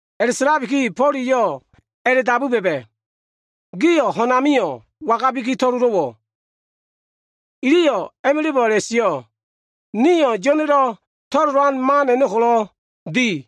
A꞉la꞉sa꞉labikiyo꞉, Fo꞉l eyo꞉ a꞉la꞉dabu ba꞉ba꞉, “Gio꞉ ho꞉n amio꞉ wangabi to꞉lolo꞉wo꞉?” Iliyo꞉ a꞉ma꞉la꞉bo꞉ a꞉la꞉sio꞉, “Nio꞉ Yo꞉na꞉lo꞉ to꞉lolan man a꞉no꞉ ko꞉lo꞉ di.”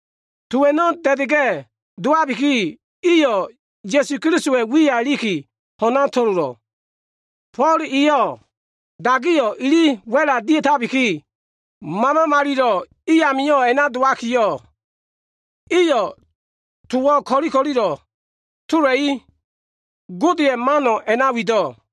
To a꞉no꞉ da꞉da꞉ga꞉ dowabiki, iyo꞉ Ya꞉su Kelisowa꞉ wiya iliki, ho꞉na to꞉lolo꞉. Fo꞉l e dagiyo꞉ ili wa꞉la dia꞉tabiki, Mama Malilo꞉ a꞉no꞉ i amio꞉ a꞉na dowakiyo꞉, iyo꞉ towo꞉ ko꞉li ko꞉lilo꞉ tolaki, Godeya꞉ mano꞉ a꞉na wido꞉.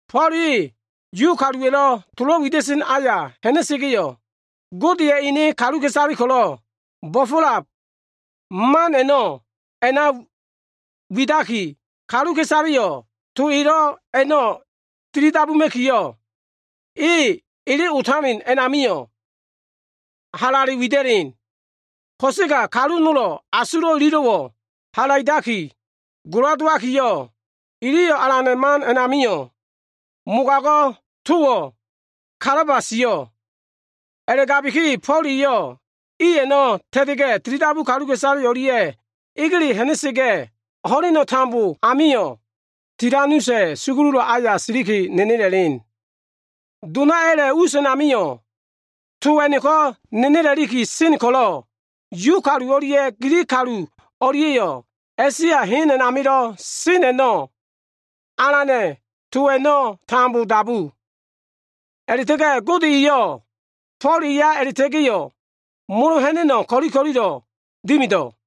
Fo꞉l e Yu kaluwa꞉lo꞉ tolo꞉ wida꞉sen aya ha꞉na꞉sa꞉ga꞉yo꞉, Godeya꞉ enedo꞉ kaluka꞉isale ko꞉lo꞉ bo꞉fo꞉lab man a꞉no꞉ widaki, kaluka꞉isaleyo꞉ to elo꞉ a꞉no꞉ tilidabuma꞉kiyo꞉, e ele otalen a꞉namio꞉ halale wida꞉len. Ko꞉sega kalu nolo꞉ asulo꞉ ililo꞉wo꞉ halaidaki gola dowakiyo꞉, iliyo꞉ Alana꞉ man a꞉namio꞉ mogago꞉ towo꞉ kalaba sio꞉. A꞉la꞉gabiki, Fo꞉l eyo꞉ iyo꞉ a꞉na ta꞉ta꞉ga꞉yo꞉, tilidabu kaluka꞉isale o꞉lia꞉yo꞉ egele ha꞉na꞉sa꞉ga꞉, ho꞉leno꞉ tambo amio꞉ Tilanusa꞉ sugululo꞉ aya siliki, nenela꞉len. Donayo꞉ a꞉la꞉ us a꞉namio꞉, to a꞉no꞉ko꞉ nenela꞉li sen ko꞉lo꞉, Yu kalu o꞉lia꞉ Gilig kalu o꞉lia꞉yo꞉ A꞉sia hen a꞉namilo꞉ sen a꞉no꞉ Alana꞉ to a꞉no꞉ tambo dabu. A꞉la꞉ta꞉ga꞉ Gode eyo꞉ Fo꞉l eya a꞉la꞉ta꞉ga꞉yo꞉ molo ha꞉na꞉no꞉ ko꞉li ko꞉lilo꞉ dimido꞉.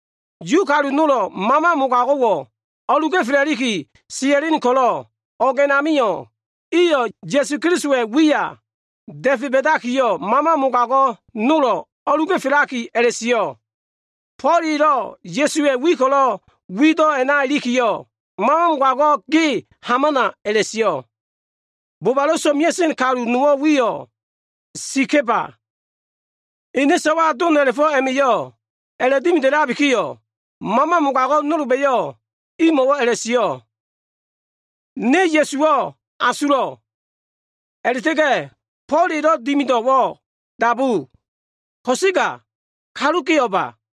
Yu kalu nolba꞉yo꞉ mama mogago꞉wo꞉ o꞉lu ga꞉fela꞉li sia꞉sen ko꞉lo꞉, o꞉g a꞉namio꞉ iyo꞉ Ya꞉su Kelisowa꞉ wiyo꞉ da꞉fe ba꞉dakiyo꞉, mama mogago꞉ nolo꞉ o꞉luga꞉felaki a꞉la꞉sio꞉, “Fo꞉l elo꞉ Ya꞉suwa꞉ wi ko꞉lo꞉ wido꞉ a꞉na ilikiyo꞉, mama mogago꞉ ge hamana,” a꞉la꞉sio꞉. Bobalo꞉ so꞉mea꞉sen misa꞉ kalu nowo꞉ ene wiyo꞉ Sigeba, ene so꞉wa doma꞉la꞉fo꞉ a꞉ma꞉yo꞉ a꞉la꞉dimidabikiyo꞉, mama mogago꞉ nolba꞉yo꞉ imo꞉wo꞉ a꞉la꞉sio꞉, “Ne Ya꞉suwo꞉ asulo꞉. A꞉la꞉ta꞉ga꞉ Fo꞉l elo꞉ dimido꞉wo꞉ dabu. Ko꞉sega kalu ge o꞉ba?”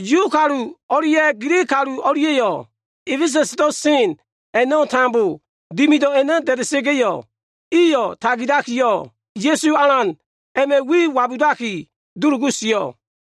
Yu kalu o꞉lia꞉ Gilig kalu o꞉lia꞉ A꞉fesa꞉sdo꞉ sen a꞉no꞉ tambo, dimido꞉ a꞉no꞉ da꞉da꞉sa꞉ga꞉yo꞉, iyo꞉ tagilakiyo꞉, Ya꞉su Alan a꞉ma꞉ wiyo꞉ wabudaki dulugu sio꞉.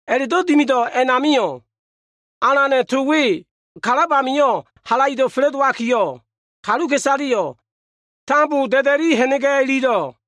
A꞉la꞉do꞉ dimido꞉ a꞉namio꞉, Alana꞉ to we kalab amio꞉ halaido꞉ fa꞉la꞉dowakiyo꞉, kaluka꞉isaleyo꞉ tambo da꞉da꞉li ha꞉na꞉ga꞉ ilido꞉.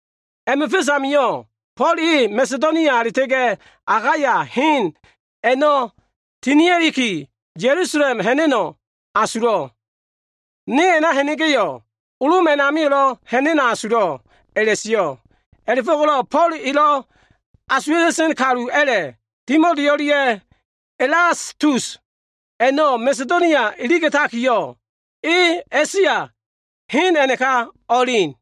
A꞉ma꞉ fa꞉s amio꞉, Fo꞉l e Masedonia a꞉la꞉ta꞉ga꞉ Akaya hen a꞉no꞉ tinia꞉liki, Ya꞉lusalem ha꞉na꞉no꞉ asulo꞉. “Ne a꞉na ha꞉na꞉ga꞉yo꞉, Lom a꞉namio꞉lo꞉ ha꞉na꞉no꞉ asulo꞉l” a꞉la꞉sio꞉. A꞉la꞉fo꞉ko꞉lo꞉ Fo꞉l elo꞉ asuwa꞉ta꞉sen kalu a꞉la꞉, Timoti o꞉lia꞉ Elastus a꞉no꞉ Masedonia iliga꞉takiyo꞉, e A꞉sia hen a꞉naka o꞉elen.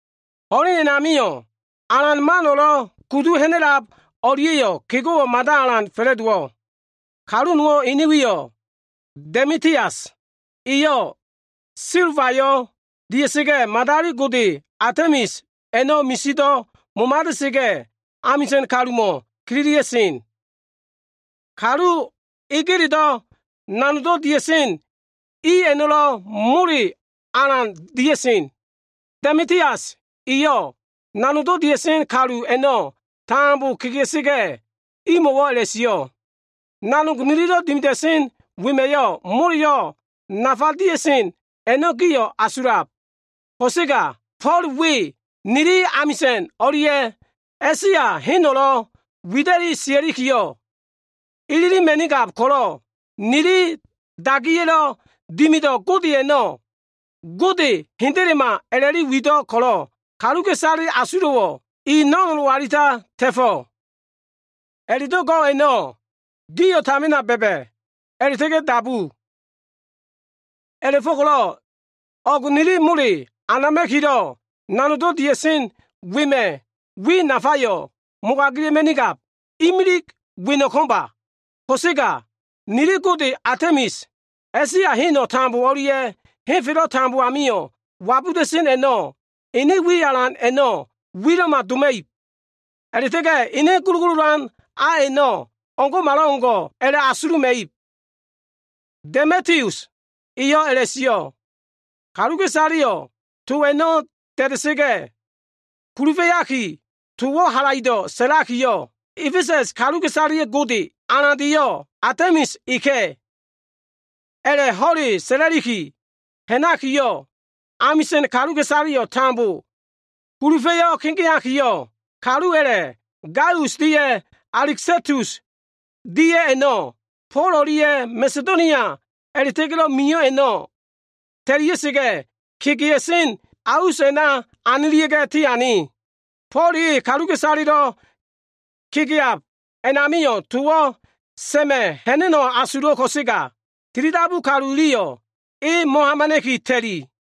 Ho꞉len a꞉namio꞉ Alana꞉ man o꞉lo꞉ kudu ha꞉na꞉lab a꞉no꞉lia꞉yo꞉ kego꞉wo꞉ mada alan fa꞉la꞉dowo꞉. Kalu nowo꞉ ene wiyo꞉ Demitius, eyo꞉ silbayo꞉ dia꞉sa꞉ga꞉, madali gode Atemis a꞉no꞉ misido꞉ momada꞉sa꞉ga꞉, amisa꞉n kalumo꞉ kililia꞉sen. Kalu egeledo꞉ nanogdo꞉ dia꞉sen i a꞉no꞉lo꞉ mole alan dia꞉sen. Demitius eyo꞉ nanogdo꞉ dia꞉sen kalu a꞉no꞉ tambo kegea꞉sa꞉ga꞉, imo꞉wo꞉ a꞉la꞉sio꞉, “Nanog nilido꞉ dimida꞉sen wema꞉yo꞉, moleyo꞉ nafa dia꞉sen a꞉no꞉ gio꞉ asulab. Ko꞉sega Fo꞉l we nili amisa꞉n o꞉lia꞉ A꞉sia heno꞉lo꞉ wida꞉li sia꞉likiyo꞉ ililima꞉nigab ko꞉lo꞉, nili dagiya꞉lo꞉ dimido꞉ gode a꞉no꞉, gode hendelema a꞉la꞉wido꞉ ko꞉lo꞉, kaluka꞉isaleya꞉ asulo꞉wo꞉ e no꞉nolo꞉ alita ta꞉fo꞉. A꞉la꞉do꞉ go꞉ a꞉no꞉ gio꞉ tamina ba꞉ba꞉ a꞉la꞉ta꞉ga꞉ dabu. A꞉la꞉fo꞉ko꞉lo꞉ o꞉go꞉ nili mole anama꞉kilo꞉ nanogdo꞉ dia꞉sen wema꞉ wi nafayo꞉ mogagila꞉ma꞉nigab. Imili weno꞉ ko꞉mba. Ko꞉sega nili gode Atemis, A꞉sia heno꞉ tambo o꞉lia꞉ henfelo꞉ tambo amio꞉ wabuda꞉sen a꞉no꞉, ene wi alan a꞉no꞉ wilo꞉ma doma꞉ib. A꞉la꞉ta꞉ga꞉ ene gulugululan a a꞉no꞉ o꞉ngo꞉malo꞉ o꞉ngo꞉ a꞉la꞉asuluma꞉ib” Demitius eyo꞉ a꞉la꞉sio꞉. Kaluka꞉isaleyo꞉ to a꞉no꞉ da꞉da꞉sa꞉ga꞉, kulufa꞉yakiyo꞉ towo꞉ halaido꞉ sa꞉lakiyo꞉, “A꞉fesa꞉s kaluka꞉isaleya꞉ gode alandeyo꞉ Atemis eka꞉.” A꞉la꞉ ho꞉le sa꞉la꞉li ha꞉nakiyo꞉, amisa꞉n kaluka꞉isaleyo꞉ tambo kulufa꞉yo꞉ kegeo꞉. Kalu a꞉la꞉ Gaius dia꞉ Alistakus dia꞉ a꞉no꞉, Fo꞉l o꞉lia꞉ Masedonia a꞉la꞉ta꞉ga꞉lo꞉ mio꞉ i a꞉no꞉ ta꞉lia꞉sa꞉ga꞉, kegea꞉sen a us a꞉na anilia꞉ga꞉ tiane. Fo꞉l e kaluka꞉isalelo꞉ kegeab a꞉namio꞉ towo꞉ sa꞉ma꞉ ha꞉na꞉no꞉ asulo꞉ ko꞉sega, tilidabu kalu iliyo꞉ e mo꞉hamana꞉ki ta꞉li.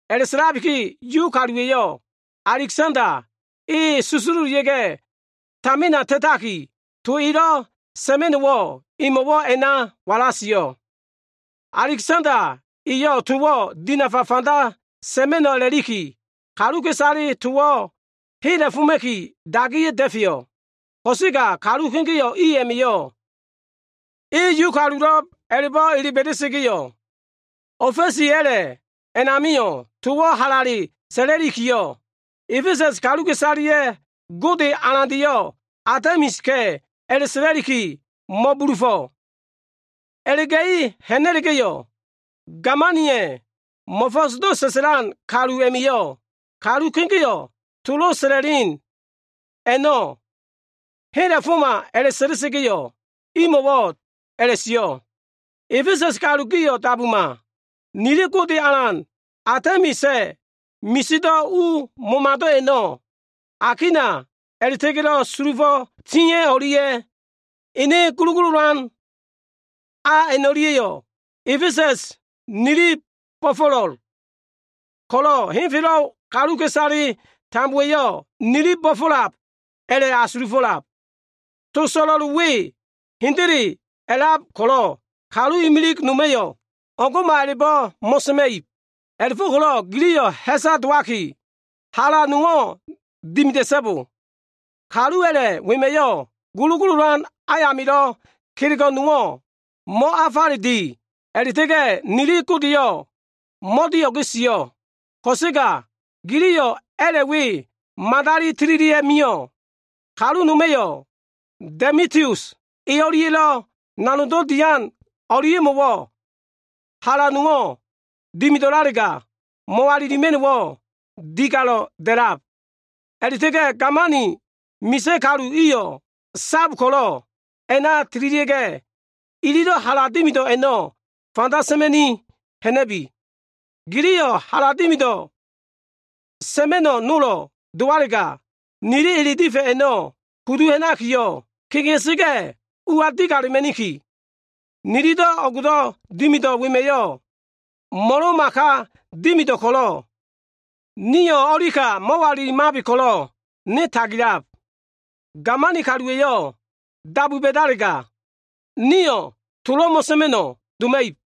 A꞉la꞉gabikiyo꞉, Yu kaluwa꞉yo꞉ Alegsanda, e susululia꞉ga꞉ tamina ta꞉takiyo꞉, to elo꞉ sa꞉ma꞉no꞉wo꞉ emo꞉wo꞉ a꞉na wala sio꞉. Alegsanda eyo꞉ towo꞉ dinafa fanda sa꞉ma꞉no꞉ a꞉la꞉liki, kaluka꞉isaleyo꞉ towo꞉ hela꞉foma꞉kiyo꞉ dagiya꞉ da꞉feyo꞉. Ko꞉sega kalu kegeo꞉ i a꞉ma꞉yo꞉, e Yu kalulo꞉b a꞉la꞉bo꞉ ele ba꞉da꞉sa꞉ga꞉yo꞉, ofa꞉si a꞉la꞉ a꞉namio꞉ towo꞉ halale sa꞉la꞉likiyo꞉, “A꞉fesa꞉s kaluka꞉isaleya꞉ gode alandeyo꞉ Atemis eka꞉” a꞉la꞉sa꞉la꞉likiyo꞉ mo꞉bulufo꞉. A꞉la꞉ga꞉i ha꞉na꞉la꞉ga꞉yo꞉, gamaniya꞉ mo꞉fo꞉sdo꞉ sa꞉sa꞉lan kalu a꞉ma꞉yo꞉, kalu kegeo꞉ tolo꞉ sa꞉la꞉len a꞉no꞉ hela꞉foma a꞉la꞉ta꞉ga꞉yo꞉, imo꞉wo꞉ a꞉la꞉sio꞉, “A꞉fesa꞉s kalu gio꞉ dabuma. Nili gode alan Atemisa꞉ misido꞉ u momado꞉ a꞉no꞉, akina a꞉la꞉ta꞉ga꞉lo꞉ sulufo꞉ tia꞉ a꞉no꞉lia꞉, ene gulugululan a a꞉no꞉lia꞉yo꞉ A꞉fesa꞉s nili bo꞉fo꞉lo꞉l ko꞉lo꞉, henfelo꞉ kaluka꞉isale tambowa꞉yo꞉ nili bo꞉fo꞉lab a꞉la꞉ asulufo꞉lab. To so꞉lo꞉l we hendele a꞉lab ko꞉lo꞉, kalu imilig noma꞉yo꞉ o꞉ngo꞉ma a꞉la꞉bo꞉ mo꞉sa꞉ma꞉ib. A꞉la꞉fo꞉ko꞉lo꞉ giliyo꞉ ha꞉sa dowaki, hala nowo꞉ dimida꞉so꞉bo. Kalu a꞉la꞉ wema꞉yo꞉ gulugululan ayamilo꞉ kelego꞉ nowo꞉ mo꞉afale di a꞉la꞉ta꞉ga꞉, nili godeyo꞉ mo꞉dio꞉ge sio꞉. Ko꞉sega giliyo꞉ a꞉la꞉ we madali tililia꞉ mio꞉. Kalu noma꞉yo꞉ Demitius e o꞉lia꞉lo꞉ nanogdo꞉ dian o꞉lia꞉mo꞉wo꞉ hala nowo꞉ dimido꞉lalega, mo꞉walilima꞉no꞉wo꞉ digalo꞉ da꞉lab a꞉la꞉ta꞉ga꞉ gamani misa꞉ kalu iyo꞉ sab ko꞉lo꞉, a꞉na tililia꞉ga꞉, ililo꞉ hala dimido꞉ a꞉no꞉ fanda sa꞉ma꞉ni ha꞉na꞉bi. Giliyo꞉ hala dimido꞉ sa꞉ma꞉no꞉ nolo꞉ dowalega, nili ele difa꞉ a꞉no꞉ kudu ha꞉nakiyo꞉, kegea꞉sa꞉ga꞉ ua digalema꞉niki. Nilido꞉ o꞉gdo꞉ dimido꞉ wema꞉yo꞉ mo꞉lo꞉ma ka dimido꞉ ko꞉lo꞉, nio꞉ o꞉li ka mo꞉walilimabe ko꞉lo꞉ ne tagilab. Gamani kaluwa꞉yo꞉ dabu ba꞉dalega, nio꞉ tolo꞉ mo꞉sa꞉ma꞉no꞉ doma꞉ib.”